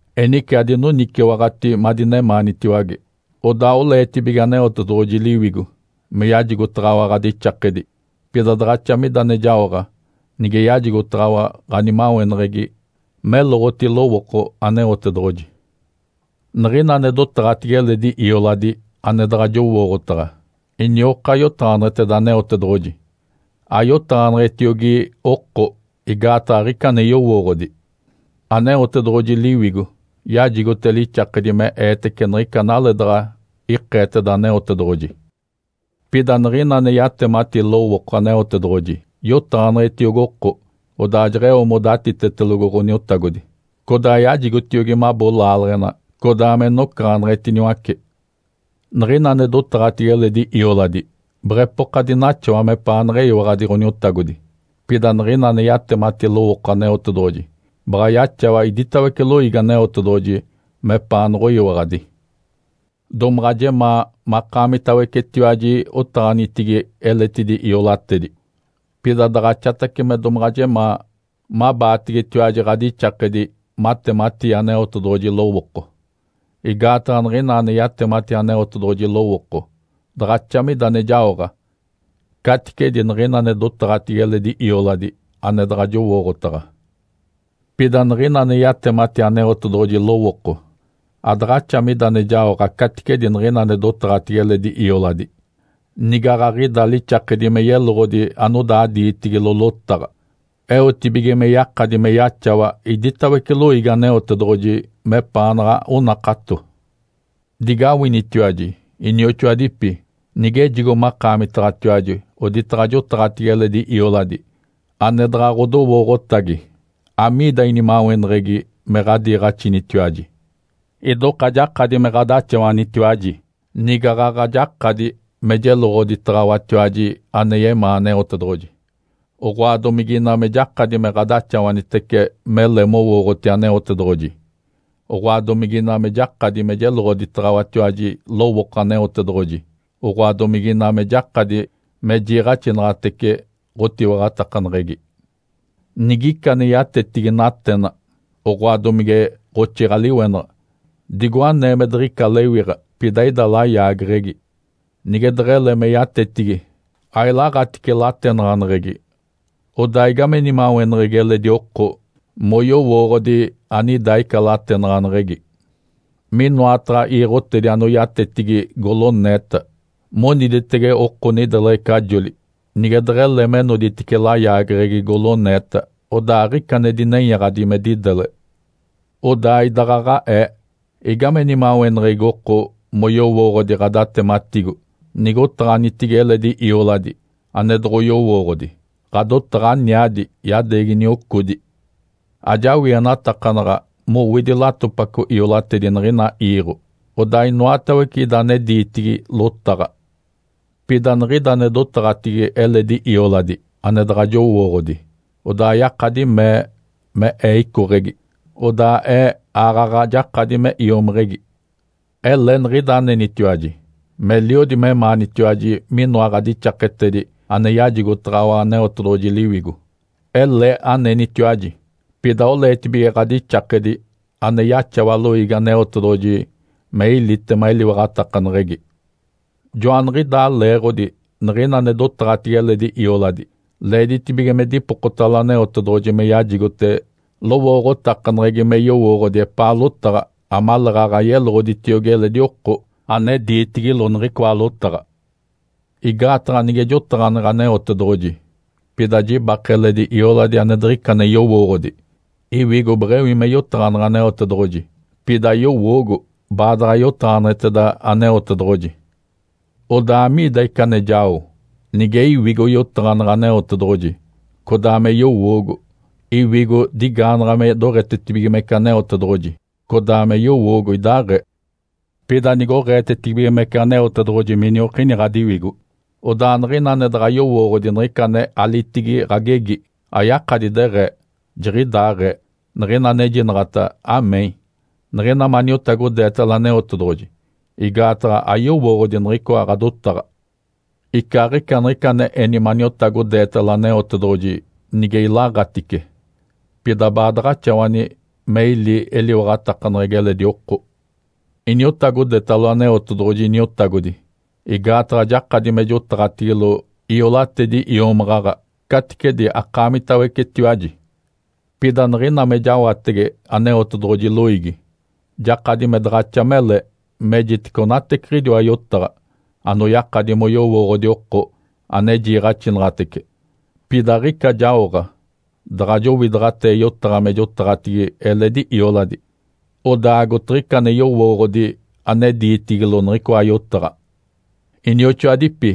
Enice adinoniciwaɡ̶ati madinemaanitiwage. Odaa oleetibige Aneotedoɡ̶oji Liwigo me yajigotaɡ̶awa ɡ̶adixakedi, pida daɡ̶axa mida ane jaoɡ̶a nige yajigotaɡ̶awa ɡ̶animaweneɡ̶egi meloɡ̶oti lowooko Aneotedoɡ̶oji. Niɡ̶ina ane dotaɡ̶atigi eledi ioladi ane daɡ̶a jowooɡ̶otaɡ̶a inioka yotaɡ̶aneɡ̶eteda Aneotedoɡ̶oji ayotaɡ̶aneɡ̶etiogi oko, igaataɡ̶a aɡ̶ica ane yowooɡ̶odi. Aneotedoɡ̶oji Liwigo yajigote lixakedi me eetece niɡ̶ica analee daɡ̶a ikeeteda Aneotedoɡ̶oji. Pida niɡ̶ina ane yatemati lowooko Aneotedoɡ̶oji yotaɡ̶aneɡ̶etiogi oko, odaa jeɡ̶eo modatitetelogo Ǥoniotagodi, codaa yajigotiogi mabo laaleɡ̶ena codaa me nocaɡ̶aneɡ̶etiniwace. Niɡ̶ina ane dotaɡ̶atigi eledi ioladi beɡ̶epoka dinaxawa mepaanaɡ̶a eyiwaɡ̶adi Ǥoniotagodi, pida niɡ̶ina ane yatemati lowooko Aneotedoɡ̶oji baɡ̶a yaxawa iditawece loiigi Aneotedoɡ̶oji mepaanoɡ̶oyiwaɡ̶adi. Domaɡ̶a jemaa makaamitawecetiwaji otaɡ̶anitigi eletidi iolatedi, pida daɡ̶axatace me domaɡ̶a jemaa mabaategetiwaji ɡ̶adixakedi matematii Aneotedoɡ̶oji lowooko. Igaataɡ̶a niɡ̶ina ane yatemati Aneotedoɡ̶oji lowooko daɡ̶axa mida ane jaoɡ̶a caticedi niɡ̶ina ane dotaɡ̶atigi eledi ioladi ane daɡ̶a jowooɡ̶otaɡ̶a. Pida niɡ̶ina ane yatemati Aneotedoɡ̶oji lowooko adaɡ̶axa mida ane jaoɡ̶a caticedi niɡ̶ina ane dotaɡ̶atigi eledi ioladi nigaɡ̶aɡ̶ida lixakedi me yeloɡ̶odi anodaa diitigilo lotaɡ̶a, eotibige me yakadi me yaxawa iditawece loiigi Aneotedoɡ̶oji mepaanaɡ̶a onakato. Digawinitiwaji, inioxoadipi! Nigejigo makaamitaɡ̶atiwaji oditaɡ̶a jotaɡ̶atigi eledi ioladi ane daɡ̶a ɡ̶odowooɡ̶otagi, amiida inimaweneɡ̶egi me ɡ̶adaxawanitiwaji? Idoka jakadi me ɡ̶adaxawanitiwaji nigaɡ̶aɡ̶a jakadi me jeloɡ̶oditaɡ̶awatiwaji ane yemaa Aneotedoɡ̶oji, oɡ̶oa domigina me jakadi me ɡ̶adaxawanitece mele mowooɡ̶oti Aneotedoɡ̶oji, oɡ̶oa domigina me jakadi me jeloɡ̶oditaɡ̶awatiwaji lowooko Aneotedoɡ̶oji, oɡ̶oa domigina me jakadi me jiiɡ̶axinaɡ̶atece ɡ̶otiwaɡ̶atakaneɡ̶egi. Nigica ane yatetigi natena, oɡ̶oa domige ɡ̶oxiiɡ̶a-liwenaɡ̶a, digo anee me diɡ̶ica lewiɡ̶a pida ida layaageɡ̶egi. Nige deɡ̶ele me yatetigi, ailaɡ̶atice latenaɡ̶aneɡ̶egi, odaa igame nimaweneɡ̶egi eledi oko moyowooɡ̶odi anida ica latenaɡ̶aneɡ̶egi? Minoataɡ̶a iiɡ̶otedi anoyatetigi goloneeta moniditege oko nideleɡ̶ecajoli, nige deɡ̶ele me noditice layaageɡ̶egi goloneeta, odaa aɡ̶ica ane dinenyaɡ̶adi me didele. Odaa idaɡ̶aɡ̶aee, igame nimaweneɡ̶egi oko moyowooɡ̶odi ɡ̶adatematigo nige otaɡ̶anitigi eledi ioladi ane doɡ̶oyowooɡ̶odi? Ǥadotaɡ̶a aniadi, yadeegi niocodi. Ajawienatakanaɡ̶a mowidi latopaco iolatedi niɡ̶ina iiɡ̶o, odaa inoatawece ida ane diitigi lotaɡ̶a. Pida niɡ̶ida ane dotaɡ̶atigi eledi ioladi ane daɡ̶a jowooɡ̶odi, odaa yakadi mee me ee icoɡ̶egi, odaa ee aaɡ̶aɡ̶a jakadi me iomiɡ̶igi. Ele niɡ̶ida anenitiwaji. Meliodi memaanitiwaji minoa ɡ̶adixaketedi ane yajigotaɡ̶awa Aneotedoɡ̶oji Liwigo. Ele anenitiwaji, pida oleetibige ɡ̶adixakedi ane yaxawa loiigi Aneotedoɡ̶oji me ilitema eliwaɡ̶atakaneɡ̶egi. Joaniɡ̶idaa leeɡ̶odi niɡ̶ina ane dotaɡ̶atigi eledi ioladi leeditibige me dipokotalo Aneotedoɡ̶oji me yajigote lowooɡ̶otakaneɡ̶egi me yowooɡ̶odi epaa lotaɡ̶a amaleeɡ̶aɡ̶a yeloɡ̶oditiogi eledi oko ane diitigilo niɡ̶icoa lotaɡ̶a. Igaataɡ̶a nige jotaɡ̶aneɡ̶e Aneotedoɡ̶oji, pida jibake eledi ioladi ane diɡ̶ica ane yowooɡ̶odi, iwigo beɡ̶ewi me yotaɡ̶aneɡ̶e Aneotedoɡ̶oji, pida yowoogo baadaɡ̶a yotaɡ̶aneɡ̶eteda Aneotedoɡ̶oji. Odaa, amiida ica ane jao? Nige iwigo yotaɡ̶aneɡ̶e Aneotedoɡ̶oji, codaa me yowoogo. Iwigo digaanaɡ̶a me doɡ̶etetibigimece Aneotedoɡ̶oji, codaa me yowoogo idaaɡ̶ee. Pida nigoɡ̶eetetibigimece Aneotedoɡ̶oji miniokini ɡ̶adiwigo, odaa niɡ̶ina ane daɡ̶a yowooɡ̶odi niɡ̶ica ane alitigi ɡ̶agegi ayakadi deɡ̶ee, “Jiɡ̶idaaɡ̶ee”, niɡ̶ina anejinaɡ̶ata “Amém”, niɡ̶ina maniotagodeetalo Aneotedoɡ̶oji, igaataɡ̶a ayowooɡ̶odi niɡ̶icoa ɡ̶adotaɡ̶a. Icaaɡ̶ica niɡ̶ica ane eni maniotagodeetalo Aneotedoɡ̶oji nige ilaɡ̶atice, pida baadaɡ̶axawani me ili eliwaɡ̶atakaneɡ̶egi eledi oko. Iniotagodetalo Aneotedoɡ̶oji Iniotagodi igaataɡ̶a jakadi me jotaɡ̶atigilo iolatedi iomaɡ̶aɡ̶a caticedi akaamitawecetiwaji. Pida niɡ̶ina me jawatege Aneotedoɡ̶oji loiigi, jakadi me daɡ̶axa mele mejitece onateciɡ̶idiwa yotaɡ̶a anoyakadi moyowooɡ̶odi oko ane jiiɡ̶axinaɡ̶atece, pida aɡ̶ica jaoɡ̶a daɡ̶a jowidaɡ̶atee yotaɡ̶a me jotaɡ̶atigi eledi ioladi, odaa agotiɡ̶ica ane yowooɡ̶odi ane diitigilo niɡ̶icoa yotaɡ̶a. Inioxoadipi,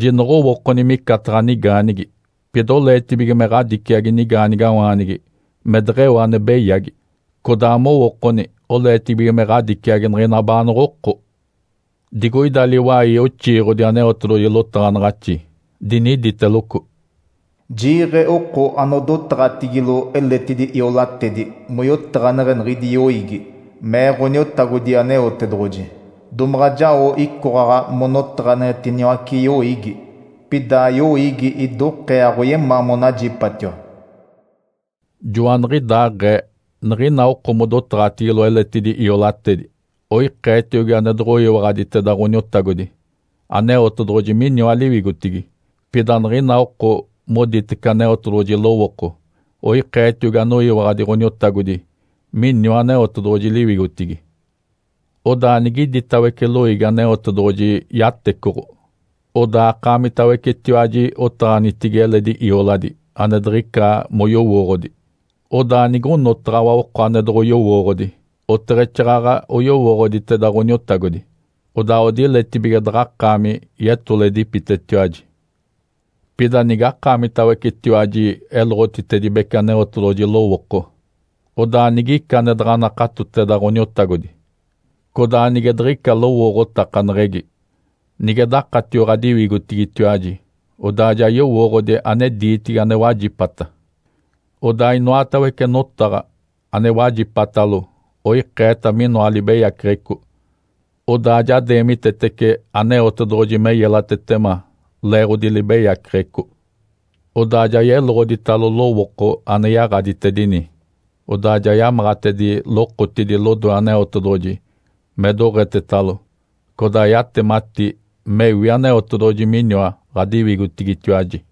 jinoɡ̶owookoni micataɡ̶a nigaanigi. Pida oleetibige me ɡ̶adiciagi nigaanigawaanigi me deɡ̶eo ane beyagi, codaa mowookoni oleetibige me ɡ̶adiciagi niɡ̶ina baanoɡ̶oko. Digoida liwai oxiiɡ̶odi Aneotedoɡ̶oji lotaɡ̶anaɡ̶axi, diniditeloco, “‘Jiiɡ̶e oko anodotaɡ̶atigilo eletidi iolatedi moyotaɡ̶aneɡ̶e niɡ̶idi yoiigi’, mee Ǥoniotagodi Aneotedoɡ̶oji. ‘Domaɡ̶a jao icoɡ̶aɡ̶a monotaɡ̶aneɡ̶etiniwace yoiigi, pida yoiigi idokee aɡ̶oyemaa monajipatiwa.’” Joaniɡ̶idaaɡ̶ee, niɡ̶ina oko modotaɡ̶atigilo eletidi iolatedi, oikeetiogi ane doɡ̶oyiwaɡ̶aditeda Ǥoniotagodi, Aneotedoɡ̶oji miniwa liwigotigi. Pida niɡ̶ina oko moditece Aneotedoɡ̶oji lowooko, oikeetiogi anoyiwaɡ̶adi Ǥoniotagodi miniwa Aneotedoɡ̶oji liwigotigi. Odaa nigiditawece loiigi Aneotedoɡ̶oji yatecoɡ̶o, odaa akaamitawecetiwaji otaɡ̶anitigi eledi ioladi ane diɡ̶ica moyowooɡ̶odi, odaa nigonotaɡ̶awa oko ane doɡ̶oyowooɡ̶odi, oteɡ̶exaaɡ̶aɡ̶a oyowooɡ̶oditeda Ǥoniotagodi, odaa odiletibige daɡ̶akaami yetoledipitetiwaji. Pida nigakaamitawecetiwaji eloɡ̶otitedibece Aneotedoɡ̶oji lowooko, odaa nigica ane daɡ̶a nakatoteda Ǥoniotagodi codaa nige diɡ̶ica lowooɡ̶otakaneɡ̶egi, nige dakatio ɡ̶adiwigotigitiwaji, odaa ja yowooɡ̶odi ane diitigi ane wajipata, odaa inoatawece notaɡ̶a ane wajipatalo oikeeta minoa libeyaceɡ̶eco, odaa ja deemitetece Aneotedoɡ̶oji me yelatetema leeɡ̶odi libeyaceɡ̶eco. Odaa ja yeloɡ̶oditalo lowooko ane yaɡ̶aditedini, odaa ja yamaɡ̶atedi lokotidi lodoe Aneotedoɡ̶oji me doɡ̶etetalo. Codaa yatemati mewi Aneotedoɡ̶oji miniwa ɡ̶adiwigotigitiwaji.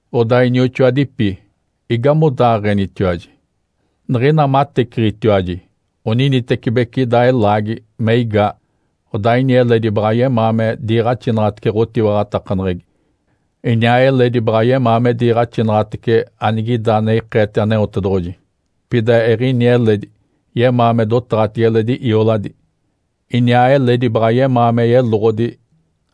Odaa, inioxoadipi, igamodaaɡ̶enitiwaji? Niɡ̶ina mateciɡ̶itiwaji, oninitecibeci ida elaagi me igaa, codaa ini eledi baɡ̶a yemaa me diiɡ̶axinaɡ̶atece ɡ̶otiwaɡ̶atakaneɡ̶egi, iniaa eledi baɡ̶a yemaa me diiɡ̶axinaɡ̶atece anigida ane ikeete Aneotedoɡ̶oji, pida eɡ̶ini eledi yemaa me dotaɡ̶atigi eledi ioladi, iniaa eledi baɡ̶a yemaa me yeloɡ̶odi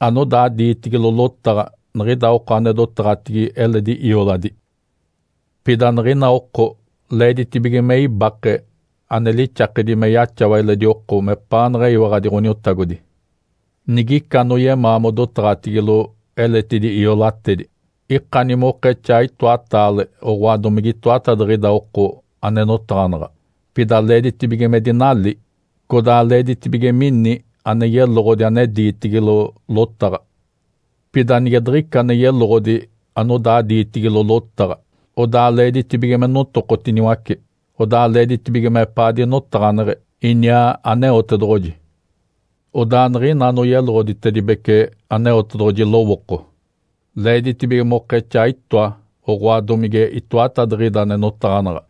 anodaa diitigilo lotaɡ̶a niɡ̶ida oko ane dotaɡ̶atigi eledi ioladi. Pida niɡ̶ina oko leeditibige me ibake ane lixakedi me yaxawa eledi oko mepaanaɡ̶a eyiwaɡ̶adi Ǥoniotagodi. Nigica anoyemaa modotaɡ̶atigilo eletidi iolatedi, ikani mokexaa itoataale oɡ̶oa domige itoatadiɡ̶ida oko ane notaɡ̶anaɡ̶a, pida leeditibige me dinali, codaa leeditibige mini ane yeloɡ̶odi ane diitigilo lotaɡ̶a. Pida nige diɡ̶ica ane yeloɡ̶odi anodaa diitigilo lotaɡ̶a, odaa leeditibige me notokotiniwace, odaa leeditibige mepaa dinotaɡ̶aneɡ̶e iniaa Aneotedoɡ̶oji. Odaa niɡ̶ina anoyeloɡ̶oditedibece Aneotedoɡ̶oji lowooko, leeditibige mokexaa itoa oɡ̶oa domige itoatadiɡ̶ida ane notaɡ̶anaɡ̶a,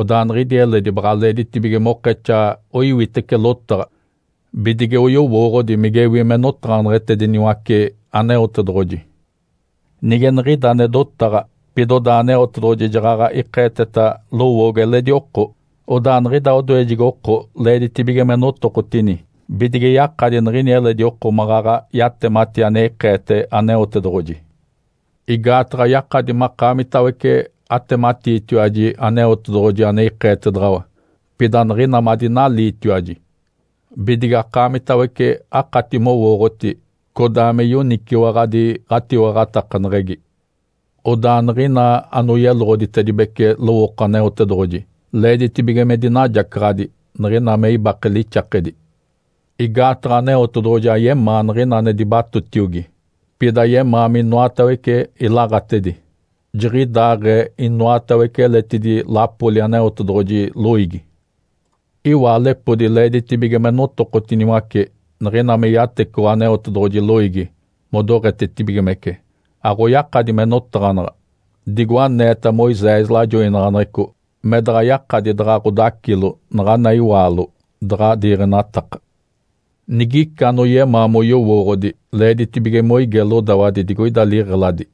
odaa niɡ̶idi eledi baɡ̶a leeditibige mokexaa oiwitece lotaɡ̶a bidige oyowooɡ̶odi migewi me notaɡ̶aneɡ̶etediniwace Aneotedoɡ̶oji. Nige niɡ̶ida ane dotaɡ̶a, pida odaa Aneotedoɡ̶oji jaɡ̶aɡ̶a ikeeteta lowoogo eledi oko, odaa niɡ̶ida odoejegi oko leeditibige me notokotini bidige yakadi niɡ̶ini eledi oko maɡ̶aɡ̶a yatemati ane ikeete Aneotedoɡ̶oji. Igaataɡ̶a yakadi makaamitawece atematiitiwaji Aneotedoɡ̶oji ane ikeetedaɡ̶awa, pida niɡ̶ina madinaliitiwaji, bidige akaamitawece akati mowooɡ̶oti codaa me yoniciwaɡ̶adi ɡ̶atiwaɡ̶atakaneɡ̶egi. Odaa niɡ̶ina anoyeloɡ̶oditedibece lowooko Aneotedoɡ̶oji leeditibige me dinajacaɡ̶adi niɡ̶ina me ibake lixakedi. Igaataɡ̶a Aneotedoɡ̶oji ayemaa niɡ̶ina ane dibatotiogi, pida yemaa minoatawece ilaɡ̶atedi. Jiɡ̶idaaɡ̶ee inoatawece eletidi lapoli Aneotedoɡ̶oji loiigi. Iwaalepodi leeditibige me notokotiniwace niɡ̶ina me yatecoɡ̶o Aneotedoɡ̶oji loiigi modoɡ̶etetibigimece. Aɡ̶oyakadi me notaɡ̶anaɡ̶a. Digo aneeta Moisés lajoinaɡ̶aneɡ̶eco me daɡ̶a yakadi daɡ̶a ɡ̶odacilo naɡ̶ana iwaalo, daɡ̶a diiɡ̶enataka. Nigica anoyemaa moyowooɡ̶odi, leeditibige moige lodawadi digoida liɡ̶eladi,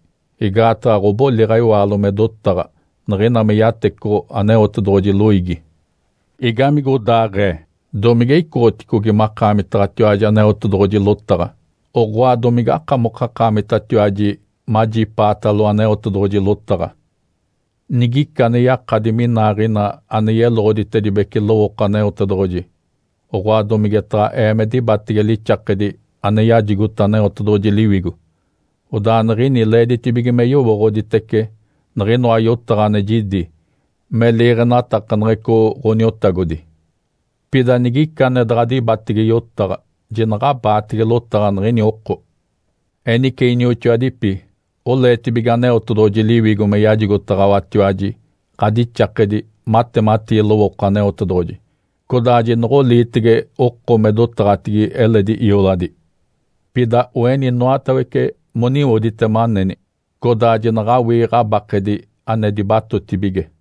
igaataɡ̶a ɡ̶oboliɡ̶a iwaalo me dotaɡ̶a niɡ̶ina me yatecoɡ̶o Aneotedoɡ̶oji loiigi. Igamigodaaɡ̶ee? Domige icoɡ̶oticogi makaamitaɡ̶atiwaji Aneotedoɡ̶oji lotaɡ̶a? Oɡ̶oa domigakamokakaamitatiwaji majipaatalo Aneotedoɡ̶oji lotaɡ̶a? Nigica ane yakadi minaaɡ̶ina ane yeloɡ̶oditedibece lowooko Aneotedoɡ̶oji, oɡ̶oa domigetaɡ̶a ee me dibatege lixakedi ane yajigota Aneotedoɡ̶oji Liwigo, odaa niɡ̶ini leeditibige me yowooɡ̶oditece niɡ̶inoa yotaɡ̶a ane jidi me liiɡ̶enatakaneɡ̶eco Ǥoniotagodi. Pida nigica ane daɡ̶a dibatege yotaɡ̶a, jinaɡ̶abaatege lotaɡ̶a niɡ̶ini oko. Enice, inioxoadipi, oleetibige Aneotedoɡ̶oji Liwigo me yajigotaɡ̶awatiwaji ɡ̶adixakedi matematii lowooko Aneotedoɡ̶oji, codaa jinoɡ̶oliitege oko me dotaɡ̶atigi eledi ioladi. Pida oeni inoatawece moniwoditema aneni, codaa jinaɡ̶awii ɡ̶abakedi ane dibatotibige.